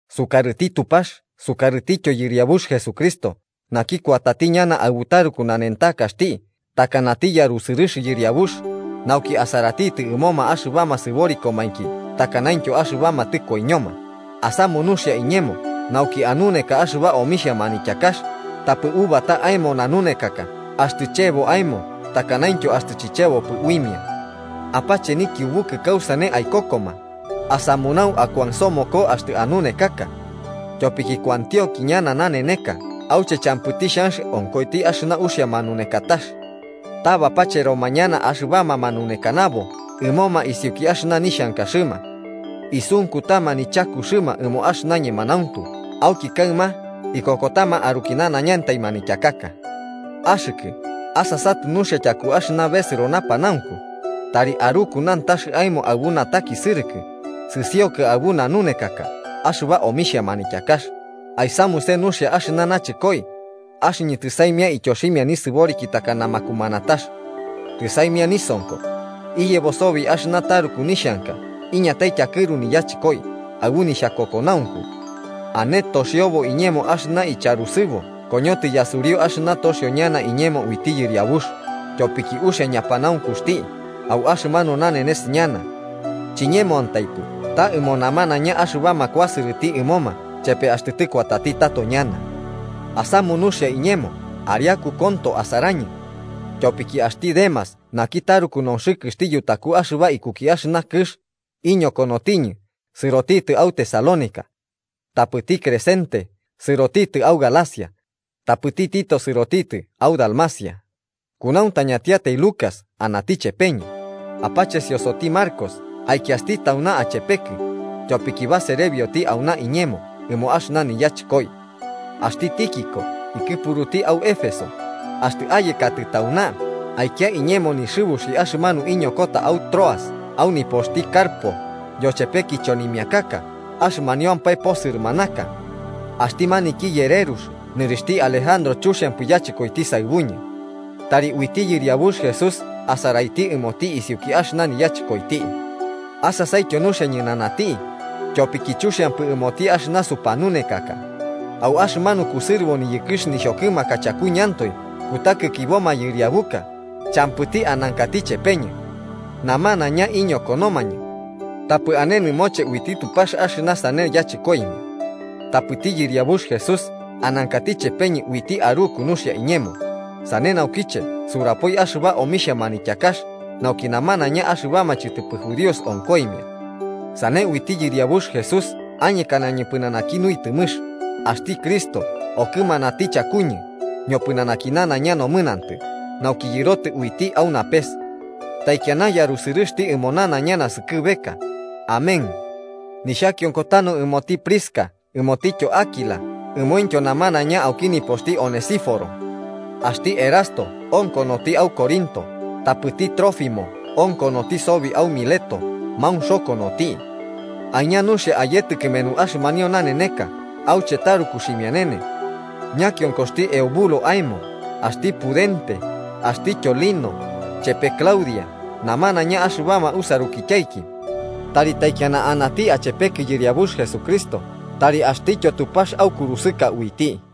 Sukarɨti Tupax sukarɨtityo Yɨriabux Jesucristo, naki kuatati ñana aɨbu taruku nanentakaxti takanati yarusɨrɨx Yɨriabux, nauki asaraiti ɨmoma axɨbama sɨborikomainki takanaintyo axɨbama tɨkoiñoma, asamu nuxia iñemo nauki anuneka axɨba omixhia manityakax, tapɨ ubata aemo nanunekaka axtɨ chebo aemo takanaintyo axtɨ chichebopɨ uimia. Apache nikiubukɨ kausane aikokoma, asamunau akuansomoko axtɨ anunekaka. Tyopiki kuantionki ñana naneneka auche champɨti xhanx onkoiti axɨna uxia manunekatax. Ta bapacheroma ñana axɨbama manunekanabo ɨmoma isiuki axɨna nixhankaxɨma. Isunkutama nichakuxɨma ɨmo axɨna ñemanauntu, auki kaɨma ikokotama aruki nanaiñantai manityakaka. Axɨkɨ asasatɨ nuxia tyaku axɨna besɨro napanaunku, tari aruku nantax aemo aɨbu natakisɨrɨkɨ, sɨsiokɨ aɨbu nanunekaka axɨba omixhia manityakax, aisamuse nuxia axɨna nachɨkoi. Axɨñɨ tɨsaimia ityoximia nisɨboriki takana makumanatax. Tɨsaimia nisonko. Iyebo sobi axɨna taruku nixhanka, iñatai tyakɨru niyachɨkoi, aɨbu nixhakokonaunku. Ane toxiobo iñemo axɨna icharusɨbo koñotɨ yasuriu axɨna toxio ñana iñemo uiti Yɨriabux, tyopiki uxia ñapanaunkuxti, au axɨmanu nanenes ñana. Chiñemoantaipɨ ta ɨmo namanaiña axɨbama kuasɨrɨti ɨmoma chepe axtɨ tɨkuatati tato ñana. Asamu nuxia iñemo ariaku konto asarañɨ. Tyopiki axti Demas naki taruku nonxɨkɨxti yutaku axɨba ikuki axɨna kɨx, iñokonotiñɨ, sɨrotitɨ au Tesalónica. Tapɨti Crescente sɨrotitɨ au Galacia, tapɨti Tito sɨrotitɨ au Dalmacia. Kunauntañatiatai Lucas anati chepeñɨ. Apachesiosoti Marcos aikiasti tauna achepekɨ, tyopiki baserebioti auna iñemo ɨmo axɨna niyachɨkoi. Axti Tíquico ikɨpukati au Éfeso. Axtɨ ayekatɨ tauna, aikia iñemo nixɨbuxi axɨmanu iñokota au Troas au nipoxti Carpo, yochepe kichonimiakaka, axɨmaniampae posɨrɨmanaka. Axti maniki yererux, nɨrixhti Alejandro chuxiampɨ yachɨkoiti saɨbuñɨ. Tari uiti Yɨriabux Jesús asaraiti ɨmoti isiuki axɨna niyachɨkoiti. Asasaityo nuxia ñɨnanati, tyopiki chuxiampɨ ɨmoti axɨna supanunekaka. Au axɨmanu kusɨrɨbo niyɨkɨx nixhokɨmaka chakuñɨantoe kutakikibo mayɨriabuka, champɨti anankati chepeñɨ. Namanaiña iñokonomañɨ. Tapɨ ane nɨmoche uiti Tupax axɨna sane yachɨkoimia. Tapɨti Yɨriabux Jesús anankati chepeñɨ uiti aruku nuxia iñemo, sane naukiche surapoi axɨba omixhia manityakax, nauki namanaiña axɨbama chɨtɨpɨ judíos onkoimia. Sane uiti Yɨriabux Jesús añekanañɨ pɨnanaki nuitɨmɨx, axti Cristo okɨmanati chakuñɨ ñopɨnanaki nanaiña nomɨnantɨ, nauki yɨrotɨ uiti au napes. ¡Taikiana Yarusɨrɨxti ɨmo nanaiña naskɨbeka! Amén. Nixhakionko tanu ɨmoti Prisca ɨmotityo Áquila, ɨmointyo namanaiña auki nipoxti Onesíforo. Axti Erasto onkonoti au Corinto, tapɨti Trófimo onkonoti sobi au Mileto maunxokonoti. Aiña nuxia ayetɨ kɨmenu axɨmanio naneneka auche taruku xhimianene. Ñakionkoxti Eubulo aemo, axti Pudente, axtityo Lino, chepe Claudia namanaiña axɨbama usarukityaiki. Tari taikiana anati achepekɨ Yɨriabux Jesucristo, tari axtityo Tupax aukurusɨka uiti.